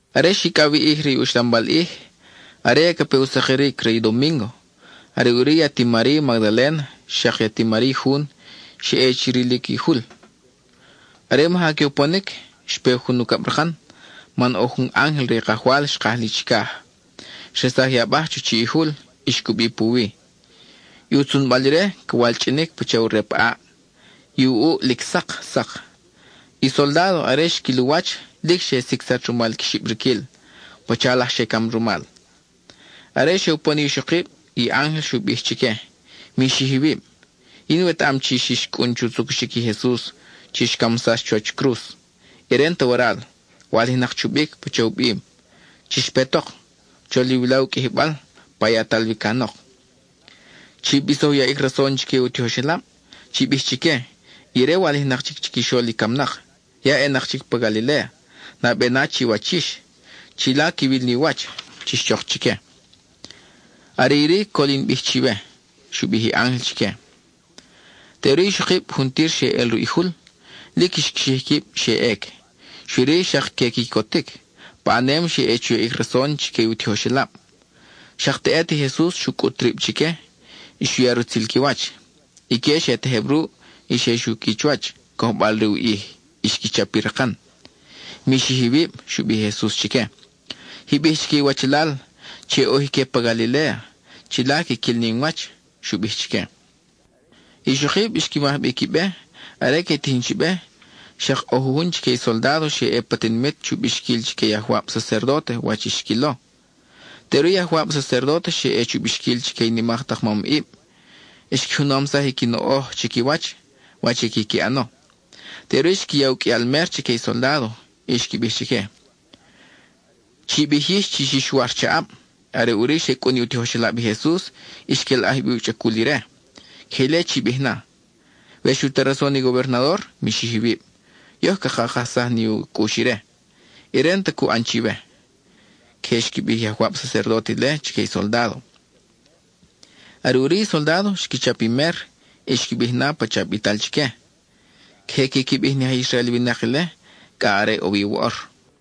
Are xicʼaw i ʼij re i uxlambal ʼij, are ya ca pe i u sakiric re i domíngo, are ʼuri i ati Mariy Magdaléna, xak i ati Mariy jun, xe ʼe chu rilic i jul. Are maja que uponic, xpe jun ucabrakan, man ʼo jun ángel re i Kajwal xkaj li chicaj, xresaj i abaj chu chiʼ i jul, y xcubi puwi. I u tzunbal ire ca walchʼinic pacha u rep ʼaʼ; i u ʼuʼ lic sak, sak. I soldádo, are xquil u wach, lic que sicsat rumal qui xibriquil, pacha laj xe cam rumal. Are xe upon i ixokib, i ángel xu bij chique: —Mi xij iwib. Yin wetaʼam chi xix cʼun chu tzucuxic i Jesus chi xcamsax chuwach cruz. Ire n-ta waral; walijnak chubic pacha i u bim. Chix petok, chol iwila u qʼuijibal pa yatal wi canok. Chi bisoj u yaʼic rason chique i u tijoxelab. Chi bij chique: “Ire walijnak chic chiquixol i camnak; ya ʼenak chic pa Galiléa, nabe na chiwach yix; chila quiwil ni u wach,” chix chok chique. Are iri col in bij chiwe —xu bij i ángel chique. Teʼuri i ixokib juntir xe ʼel ruʼ i jul. Lic xqui xij quib xe ʼec, xui-ri xak que quicotic. Paʼanem xe ʼe chu yaʼic rason chique u tijoxelab. Xak teʼet i Jesus xu cʼut rib chique, y xu ya rutzil qui wach. Ique xe tejeb ruʼ y xe xuqui chuwach, cojbal re u ʼij, y xqui chap i rakan. —Mi xij iwib —xu bij i Jesus chique—. Ji bij chique i wachalal che ʼoj ique pa Galiléa; chila quiquil ni in wach —xu bij chique. I ixokib xqui maj bi qui be. Are que tijin chi be, xak ʼo jujun chique i soldádo xe ʼe pa tinimit chu bixquil chique i ajwab sacerdóte wach i xquilo. Teʼuri i ajwab sacerdóte xe ʼe chu bixquil chique i nimak tak mamʼib. Xqui junamsaj i qui noʼoj chiquiwach, wach i quiqui ʼano. Teʼuri xqui ya uqʼuial mer chique i soldádo, y xqui bij chique: —Chi bij yix chi xix war chaʼab, y are ʼuri xe cʼun i u tijoxelab i Jesus y xquelʼaj bi u chʼacul ire. Queje ile chi bij na. We xu ta rason i gobernador, mi xij iwib; yoj caka kajsaj ni u cʼux ire; ire n-ta cu ʼan chiwe. (Queje xqui bij i ajwab sacerdóte ile chique i soldádo.) Are ʼuri i soldádo xqui chap i mer, y xqui bij na pacha bital chique. Y queje quiqui bij ni aj Israel winak ile, cʼa are ʼo wi woʼor.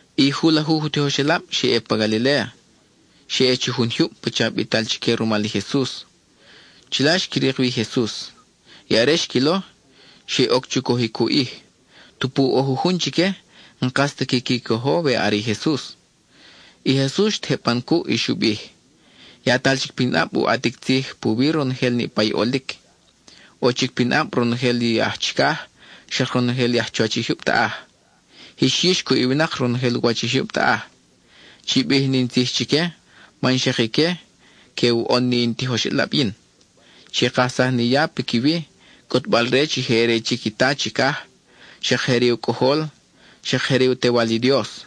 I julajuj u tijoxelab xe ʼe pa Galiléa; xe ʼe che jun jyub pacha bital chique rumal i Jesus. Chila xqui rik wi i Jesus, y are xquilo, xe oc chu cojic u ʼij, tupu ʼo jujun chique n-kas ta quiqui cojo we are i Jesus. I Jesus xtejeb pan cuʼ y xu bij: —Yatal chic pinʼab u ʼatic tzij puwi ronojel niʼpa i ʼolic. ʼO chic pinʼab ronojel i aj chicaj, xak ronojel i aj chuwach i jyub taʼaj. Jix yix cuʼ i winak ronojel u wach i jyub taʼaj. Chi bij in tzij chique man xak ique que u ʼon ni in tijoxelab yin. Chi kajsaj ni ya piquiwi, cʼutbal-re chi je re chic i Ta chicaj, xak je re i u Cʼojol, xak je re i u Tewal i Dios.